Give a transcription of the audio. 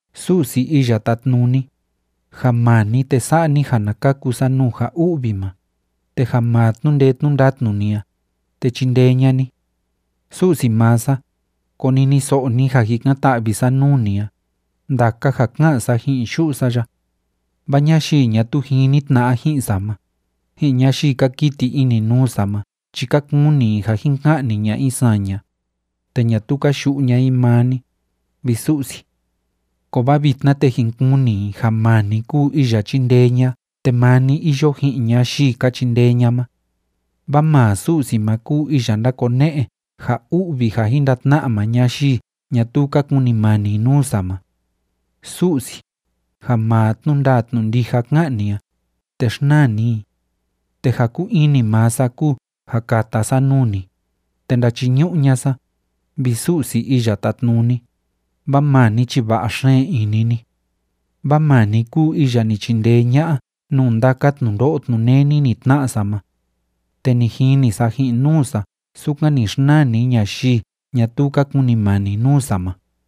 Su'si Iya Tátnuni, ja maa ni, te sa'a ni ja na kaku sa nuu ja u'vi ma, te ja maa tnu'u ndee tnu'u ndatnu ni a, te chindee ña'a ni. Su'si maa sa, koniniso'o ni ja jikan‑ta'vi sa nuu ni a, ndaka ja ká'an sa ji'in yu'u sa ya. Vaa ñayii ñatuu jini tna'a ji'in sa ma, ji'in ñayii ka kiti ini nuu sa ma chi ka kuni i ja jin ka'ni ña'a i saña, te ñatuu ka yu'u ña'a i maa ni, vi Su'si. Kovaa vitna, te jin kuni i ja maa ni kúu iya chíndee ña'a te maa ni iyo ji'in ñayii ka chindee ña'a ma. Vaa maa Su'si ma kúu iya ndakone'e ja u'vi ja jin ndatna'a maa ñayii ñatuu ka kunimani nuu sa ma. Su'si, ja maa tnu'u ndaa tnu'u ndija ká'an ni a, te xnaa ni i. Te ja kúu ini maa sa kúu ja kata sa nuu ni, te ndachiñu'u ña'a sa, vi Su'si Iya Tátnuni, vaa maa ni chi va'a xeen ini ni. Vaa maa ni kúu iya ni chindee ña'a nuu ndaka tnundo'o tnuneni ni tna'a sa ma, te ni jini sa ji'in nuu sa sukan ni xnaa ni ñayii ñatuu ka kunimani nuu sa ma.